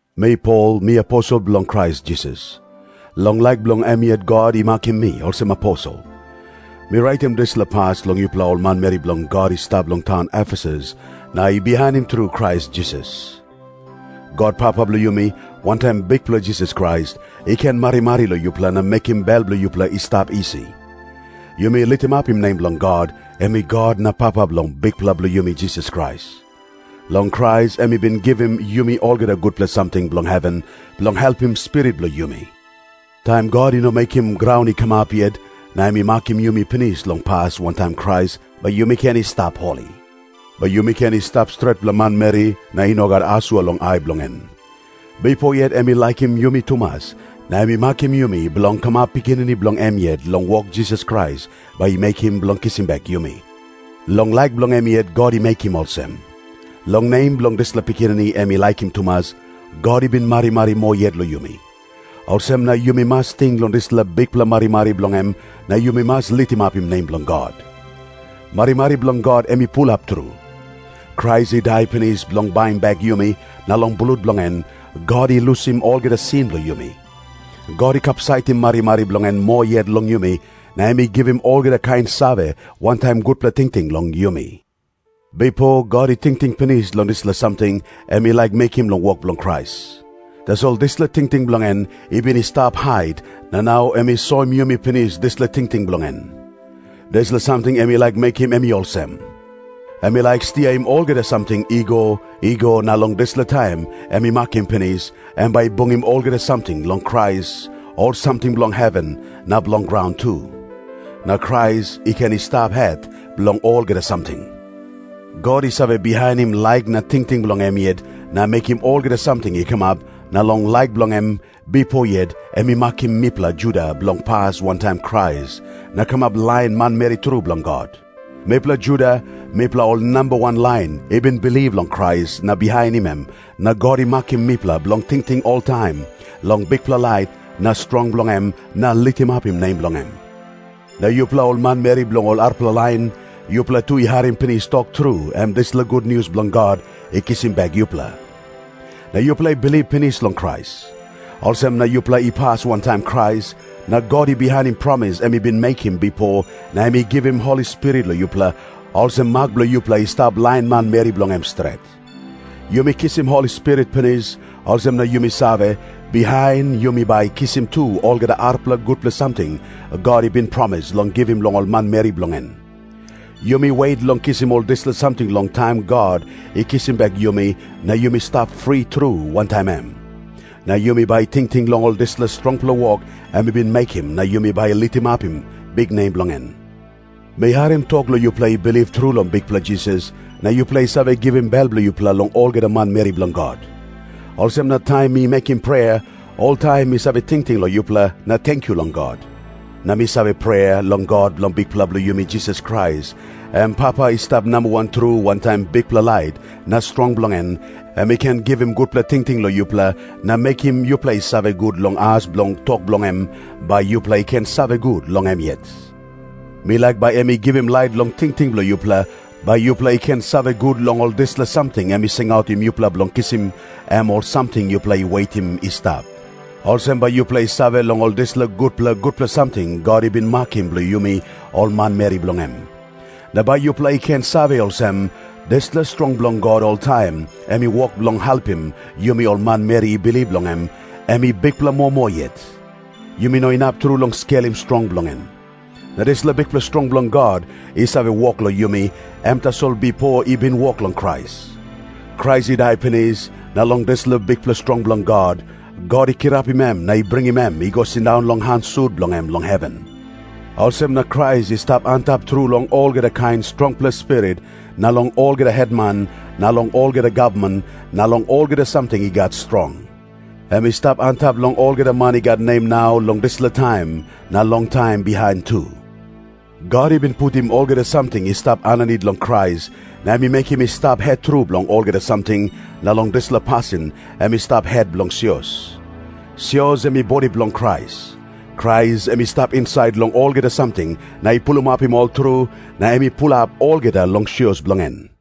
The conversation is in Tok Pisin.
Mi Pol, mi aposel bilong Krais Jisas. Long laik bilong em yet God i makim mi olsem aposel. Mi raitim dispela pas long yupela ol manmeri bilong God i stap long taun Efesus na i bihainim tru Krais Jisas. God Papa bilong yumi, wantaim Bikpela Jisas Krais, i ken marimari long yupela na mekim bel bilong yupela i stap isi. Yumi litimapim nem bilong God, em i God na Papa bilong Bikpela bilong yumi Jisas Krais. Long Krais em i bin givim yumi olgeta gutpela samting bilong heven, bilong helpim spirit bilong yumi. Taim God i no mekim graun i kamap yet, na em i makim yumi pinis long pas wantaim Krais, bai yumi ken i stap holi. Bai yumi ken i stap stretpela manmeri na i no gat asua long ai bilong en. Bipo yet em i laikim yumi tumas, na em i makim yumi bilong kamap pikinini bilong em yet long wok Jisas Krais bai i mekim bilong kisim bek yumi. Long laik bilong em yet God i mekim olsem. Long nem bilong dispela Pikinini em i laikim tumas, God i bin marimari moa yet long yumi. Olsem na yumi mas ting long dispela bikpela marimari bilong em na yumi mas litimapim nem bilong God. Marimari bilong God em i pulap tru. Krais i dai pinis bilong baim bek yumi, na long blut bilong en, God i lusim olgeta sin bilong yumi. God i kapsaitim marimari bilong en moa yet long yumi, na em i givim olgeta kain save wantaim gutpela tingting long yumi. Bipo God i tingting pinis long dispela samting em i laik mekim long wok bilong Krais. Tasol dispela tingting bilong en i bin i stap hait, na nau em i soim yumi pinis dispela tingting bilong en. Dispela samting em i laik mekim em i olsem. Em i laik stiaim olgeta samting i go i go, na long dispela taim em i makim pinis, em bai i bungim olgeta samting long Krais, ol samting bilong heven na bilong graun tu. Na Krais i ken i stap het bilong olgeta samting. God i save bihainim laik na tingting bilong em yet na mekim olgeta samting i kamap, na long laik bilong em, bipo yet em i makim mipela Juda bilong pas wantaim Krais na kamap lain manmeri tru bilong God. Mipela Juda, mipela ol namba wan lain i bin bilip long Krais na bihainim em, na God i makim mipela bilong tingting oltaim long bikpela lait na strong bilong em na litimapim nem bilong em. Na yupela ol manmeri bilong ol arapela lain, yupela tu i harim pinis tok tru, em dispela gutnius bilong God i kisim bek yupela. Na yupela i bilip pinis long Krais. Olsem na yupela i pas wantaim Krais, na God i bihainim promis em i bin mekim bipo na em i givim Holi Spirit long yupela, olsem mak bilong yupela i stap lain manmeri bilong em stret. Yumi kisim Holi Spirit pinis, olsem na yumi save, bihain yumi bai kisim tu olgeta arapela gutpela samting God i bin promis long givim long ol manmeri bilong en. Yumi wet long kisim ol dispela samting long taim God i kisim bek yumi na yumi stap fri tru wantaim em. Na yumi bai tingting long ol dispela strongpela wok em i bin mekim na yumi bai litimapim biknem bilong en. Mi harim tok long yupela i bilip tru long Bikpela Jisas, na yupela i save givim bel bilong yupela long olgeta manmeri bilong God. Olsem na taim mi mekim prea, oltaim mi save tingting long yupela na tenkyu long God. Na mi save prea long God bilong Bikpela bilong yumi Jisas Krais, em Papa i stap nambawan tru wantaim bikpela lait na strong bilong en, em i ken givim gutpela tingting long yupela na mekim yupela i save gut long as bilong tok bilong em, bai yupela i ken save gut long em yet. Mi laik bai em i givim lait long tingting bilong yupela, bai yupela i ken save gut long ol dispela samting em i singautim yupela bilong kisim, em ol samting yupela i wetim i stap. Olsem bai yupela i save long ol dispela gutpela gutpela samting God i bin makim bilong yumi ol manmeri bilong em. Na bai yupela i ken save olsem, dispela strong bilong God oltaim em i wok long helpim yumi ol manmeri i bilip long em, em i bikpela moa moa yet. Yumi no inap tru long skelim strong bilong en. Na dispela bikpela strong bilong God i save wok long yumi, em tasol bipo i bin wok long Krais. Krais i dai pinis, na long dispela bikpela strong bilong God, God i kirapim em na i bringim em i go sindaun long han sut bilong em long heven. Olsem na Krais i stap antap tru long olgeta kain strongpela spirit, na long olgeta hetman na long olgeta gavman, na long olgeta samting i gat strong. Em i stap antap long olgeta man i gat nem nau long dispela taim, na long taim bihain tu. God i bin putim olgeta samting i stap aninit long Krais, na i mekim em i stap het tru bilong olgeta samting, na long dispela pasin em i stap het bilong sios. Sios em i bodi bilong Krais. Krais em i stap insait long olgeta samting na i pulapim ol tru, na em i pulap olgeta long sios bilong en.